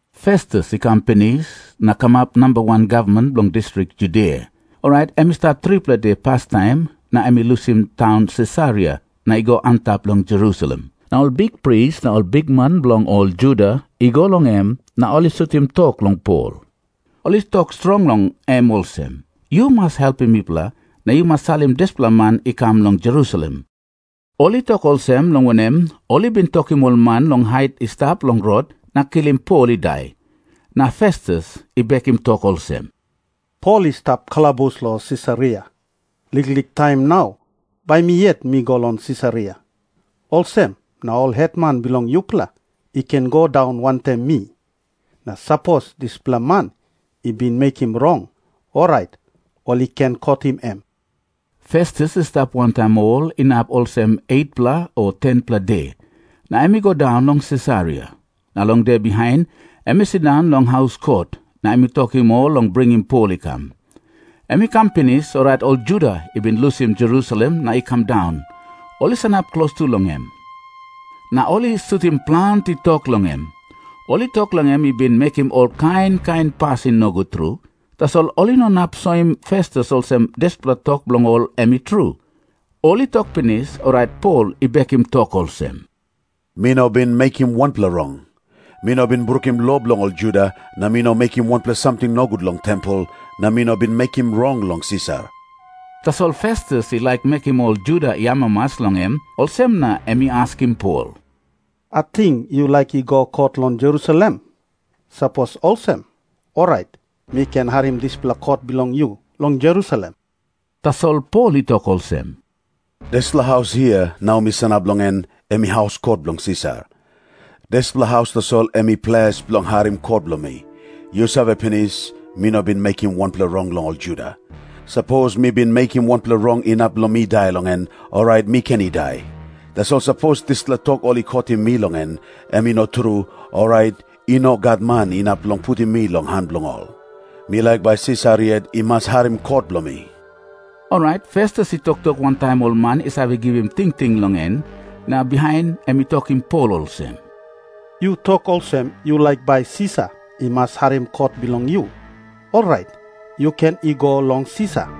Festus i kam pinis na i kamap namba wan gavman bilong distrik Judia. Orait em i stap tripela de pastaim na em i lusim taun Sisaria na i go antap long Jerusalem. Na ol bikpris na ol bikman bilong ol Juda i go long em na ol i sutim tok long Pol. Ol i tok strong long em olsem, “Yu mas helpim mipela, na yu mas salim dispela man i kam long Jerusalem.” Ol i tok olsem, long wanem, ol i bin tokim ol man long hait i stap long rot na kilim Pol i dai. Na Festus i bekim tok olsem, “Pol i stap kalabus long Sisaria. Liklik taim na bai mi yet mi go long Sisaria. Olsem na ol hetman bilong yupela i ken i go daun wantaim mi. Na sapos dispela man i bin mekim rong, orait ol i ken kotim em.” Festus i stap wantaim ol inap olsem 8-pela o 10-pela de, na em i go daun long Sisaria. Na long de bihain em i sindaun long haus kot, na em i tokim ol long bringim Pol i kam. Em i kam pinis, orait ol Juda i bin lusim Jerusalem na i kam daun, ol i sanap klostu long em, na ol i sutim planti tok long em. Ol i tok long em i bin mekim ol kain kain pasin nogut tru, tasol ol i no inap soim Festus olsem dispela tok bilong ol em i tru. Ol i tok pinis, orait Pol i bekim tok olsem, “Mi no bin mekim wanpela rong. Mi no bin brukim lo bilong ol Juda, na mi no mekim wanpela samting nogut long tempel, na mi no bin mekim rong long Sisar.” Tasol Festus i laik mekim ol Juda i amamas long em, olsem na em i askim Pol, “Ating yu laik i go kot long Jerusalem? Sapos olsem, orait mi ken harim dispela kot bilong yu long Jerusalem.” Tasol Pol i tok olsem, “Dispela haus hia, nau mi sanap long en, em i haus kot bilong Sisar. Dispela haus tasol em i ples bilong harim kot bilong mi. Yu save pinis, mi no bin mekim wanpela rong long ol Juda. Sapos mi bin mekim wanpela rong inap long mi dai long en, orait mi ken i dai. Tasol sapos dispela tok ol i kotim mi long en, em i no tru, orait i no gat man inap long putim mi long han bilong ol. Mi laik bai Sisar yet i mas harim kot bilong mi.” Orait Festus i toktok wantaim ol man i save givim tingting long en, na bihain em i tokim Pol olsem, “Yu tok olsem yu laik bai Sisar i mas harim kot bilong yu. Orait yu ken i go long Sisar.”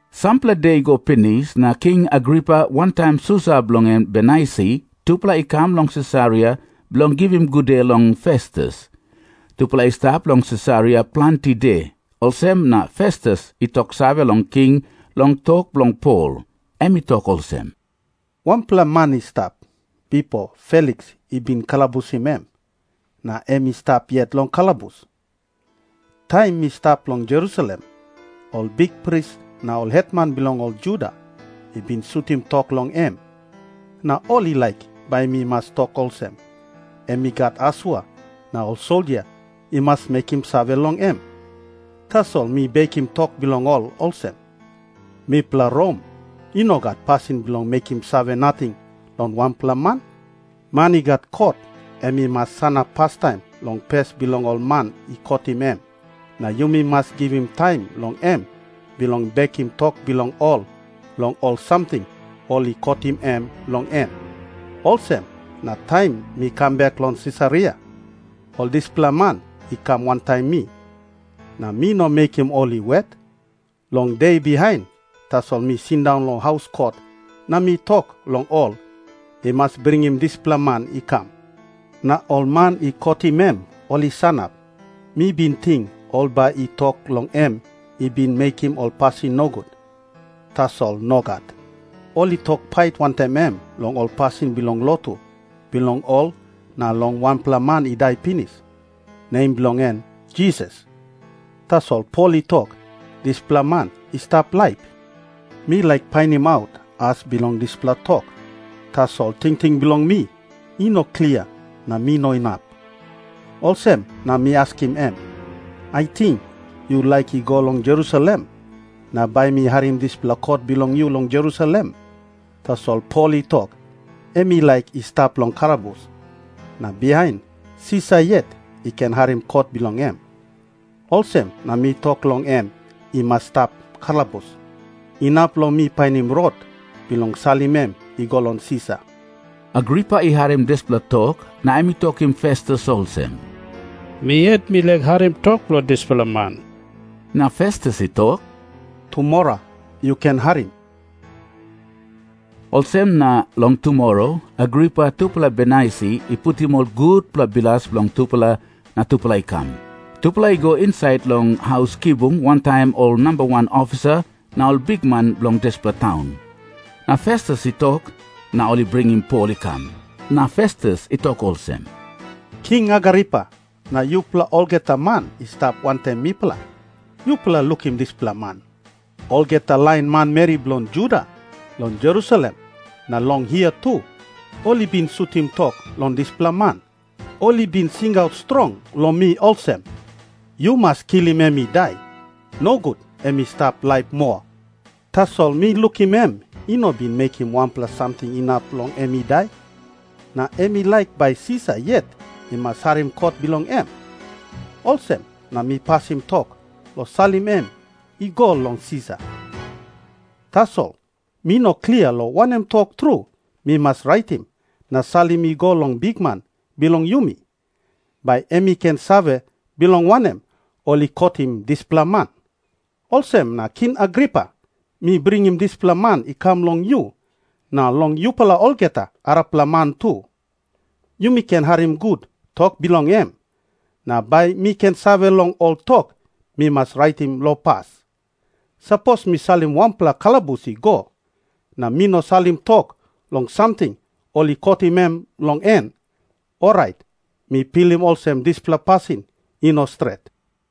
Sampela de i go pinis, na King Agripa wantaim susa bilong en Bernaisi tupela i kam long Sisaria bilong givim gude long Festus. Tupela i stap long Sisaria planti de, olsem na Festus i toksave long king long tok bilong Pol. Em i tok olsem, “Wanpela man i stap, bipo Feliks i bin kalabusim em, na em i stap yet long kalabus. Taim mi stap long Jerusalem, ol bikpris na ol hetman bilong ol Juda i bin sutim tok long em, na ol i laik bai mi mas tok olsem, em i gat asua na ol soldia i mas mekim save long em. Tasol mi bekim tok bilong ol olsem, ‘Mipela Rom i no gat pasin bilong mekim save nating long wanpela man. Man i gat kot, em i mas sanap pastaim long pes bilong ol man i kotim em, na yumi mas givim taim long em bilong bekim tok bilong ol long ol samting ol i kotim em long en.’ “Olsem na taim mi kam bek long Sisaria, ol dispela man i kam wantaim mi. Na mi no mekim ol i wet. Long de bihain tasol mi sindaun long haus kot na mi tok long ol i mas bringim dispela man i kam. Na ol man i kotim em ol i sanap. Mi bin ting ol bai i tok long em i bin mekim ol pasin nogut, tasol nogat. Ol i tok pait wantaim em long ol pasin bilong lotu bilong ol na long wanpela man i dai pinis, nem bilong en Jisas. Tasol Pol i tok, dispela man i stap laip. Mi laik painimaut as bilong dispela tok, tasol tingting bilong mi i no klia na mi no inap. Olsem na mi askim em, ‘Ating yu laik i go long Jerusalem, na bai mi harim dispela kot bilong yu long Jerusalem?’ Tasol Pol i tok, em i laik i stap long kalabus, na bihain Sisar yet i ken harim kot bilong em. Olsem na mi tok long em i mas i stap kalabus, inap long mi painim rot bilong salim em i go long Sisar.” Agripa i harim dispela tok na em i tokim Festus olsem, “Mi yet mi laik harim tok bilong dispela man.” Na Festus i tok, “Tumora yu ken harim.” Olsem na long tumora Agripa tupela Bernaisi i putim ol gutpela bilas bilong tupela na tupela i kam. Tupela i go insait long haus kibung wantaim ol namba wan ofisa na ol bikman bilong dispela taun. Na Festus i tok, na ol i bringim Pol i kam. Na Festus i tok olsem, “King Agripa, na yupela olgeta man i stap wantaim mipela, yupela lukim dispela man. Olgeta lain manmeri bilong Juda, long Jerusalem na long hia tu, ol i bin sutim tok long dispela man. Ol i bin singaut strong long mi olsem, ‘Yu mas kilim em i dai. Nogut em i stap laip moa.’ Tasol mi lukim em i no bin mekim wanpela samting inap long em i dai. Na em i laik bai Sisar yet i mas harim kot bilong em. Olsem na mi pasim tok long salim em i go long Sisar. Tasol mi no klia long wanem tok tru mi mas raitim na salim i go long bikman bilong yumi, bai em i ken save bilong wanem ol i kotim dispela man. Olsem na King Agripa, mi bringim dispela man i kam long yu, na long yupela olgeta arapela man tu. Yumi ken harim gut tok bilong em, na bai mi ken save long ol tok mi mas raitim long pas. Sapos mi salim wanpela kalabus i go, na mi no salim tok long samting ol i kotim em long en, orait mi pilim olsem dispela pasin i no stret.”